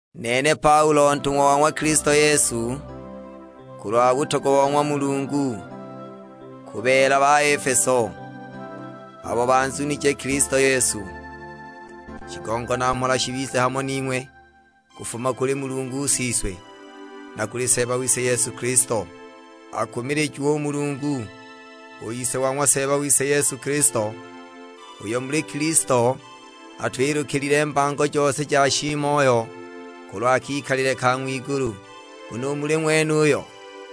Nene Paulo ntung'wa wa ng'wa Kilisto Yesu, kulwa butogwa bo ng'wa Mulungu. Ku beela [ba Efeso], abo banzunije Kilisto Yesu. Shigongo na mhola shibize hamo ning'we kufuma kuli Mulungu Siswe, na kuli Seeba wise Yesu Kilisto. Akumilijiwe u Mulungu, u Ise wa ng'wa Seeba wise Yesu Kilisto; uyo muli Kilisto atwilukilile mbango jose ja shiimoyo, kulwa kikalile ka ng'wigulu. Nguno u muli ng'wenuyo,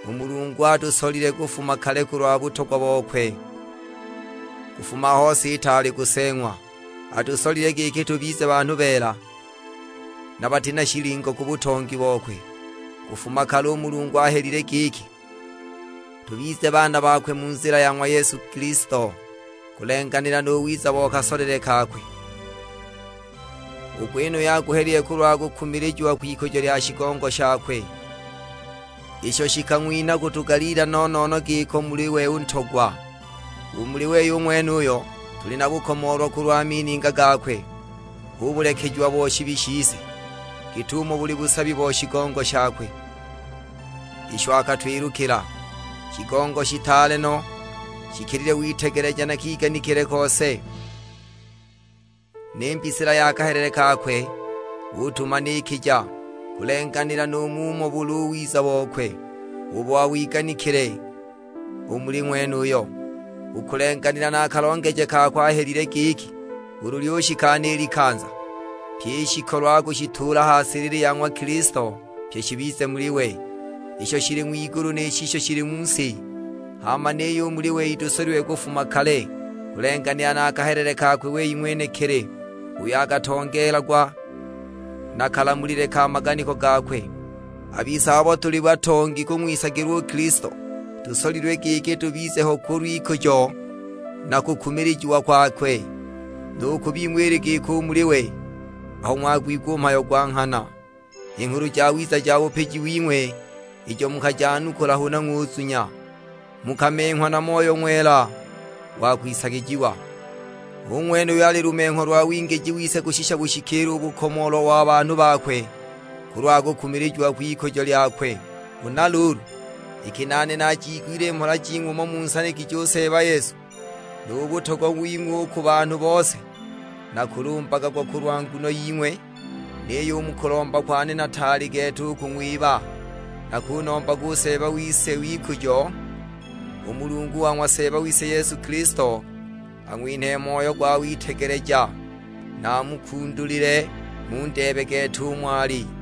u Mulungu atusolile kufuma kale kulwa butogwa bokwe; kufuma aho si itaali kuseeng'wa: atusolile giki tubize banhu beela, na bati na shilingo ku butongi bokwe. Kufuma kale u Mulungu ahelile giki, tubize baana bakwe mu nzila ya ng'wa Yesu Kilisto, kulenganila nu wiza bo kasolele kakwe. U gwenuyo aguhelile kulwa kukumilijiwa kw'ikujo lya shigongo shakwe, isho shikang'winha kutugaliila no-no-no giko u muli we u Ntogwa. U muli wei u ng'wenuyo, tuli na bukomoolwa kulwa mininga gakwe; hu bulekejiwa bo shibi shise, git'umo buli busabi bo shigongo shakwe, isho akatwilukila: shigongo shitaale no, shikilile witegeleja na kiganikile kose! Ni mbisila ya kahelele kakwe utumanikija, kulenganila nu mumo buli u wiza bokwe, ubo awiganikile u muli Ng'wenuyo. U kulenganila na a kalongeje kakwe ahelile giki, ulu lyushikana i likanza, pyi i shikolo akushituula ha silili ya ng'wa Kilisto; pye shibize muli we: isho shili ng'wigulu ni shisho shili mu si. Hama niyo u muli wei tusolilwe kufuma kale, kulenganila na kahelele kakwe wei ng'wenekili, uyo akatongeelagwa na kalamulile ka maganiko gakwe. A bise abo tuli batongi kung'wisagilwa u Kilisto, tusolilwe giki tubize ho kulw'ikujo na kukumilijiwa kwakwe. Nu ku bing'we ili giko u muli we, aho ng'wagwigwa u mhayo gwa nghana, i Nghulu Jawiza ja bupiji wing'we ijo mukajanukula huna ng'unzunya, mukamenghwa na Moyo Ng'wela wa kwisagijiwa. Hu ng'wene uyo ali lumengho lwa wingiji wise kushisha bushikiile u bukomoolwa wa banhu bakwe kulwa kukumilijiwa kw'ikujo lyakwe. Huna luulu, iki nane naajiigwile i mhola jing'we umo munsanigije u Seeba Yesu, nu butogwa wing'we u ku banhu bose, nakulumbaga gwa kulwa nguno ying'we. Niyo u mu kulomba kwane nataali gete u kung'wiba. Nakunombaga u Seeba w'ikujo, u Mulungu wa ng'wa Seeba wise Yesu Kilisto, ang'winhe moyo gwa witegeleja, na amukundulile, mundeebe gete umo ali.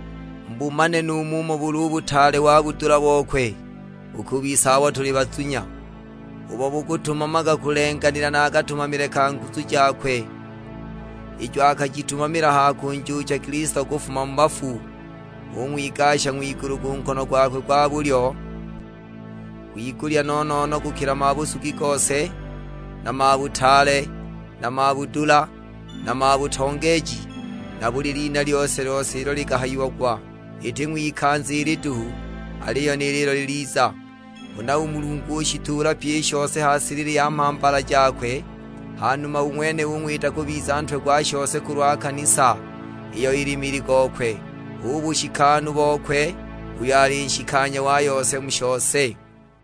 Mubumane nu mumo buli u butaale wa budula bokwe u ku bise abo tuli bazunya, ubo bukutumamaga kulenganila na katumamile ka nguzu jakwe, ijo akajitumamila ha kunjuucha Kilisto kufuma mu bafu, ung'wigasha ng'wigulu ku nkono gwakwe gwa bulyo, kwigulya no-no-no kukila mabusugi gose, na mabutaale, na mabudula, na mabutongeeji; na buli lina lyose-lyose ilo likahayiagwa, iti ng'wikanza ili duhu, aliyo ni lilo liliza. Huna u Mulungu ushituula pyi i shose ha silili ya mhambala jakwe, hanuma u ng'wene ung'wita kubiza Ntwe gwa shose kulwa kanisa, iyo ili mili gokwe, hu bushikanu bokwe uyo ali nshikanya wa yose mu shose.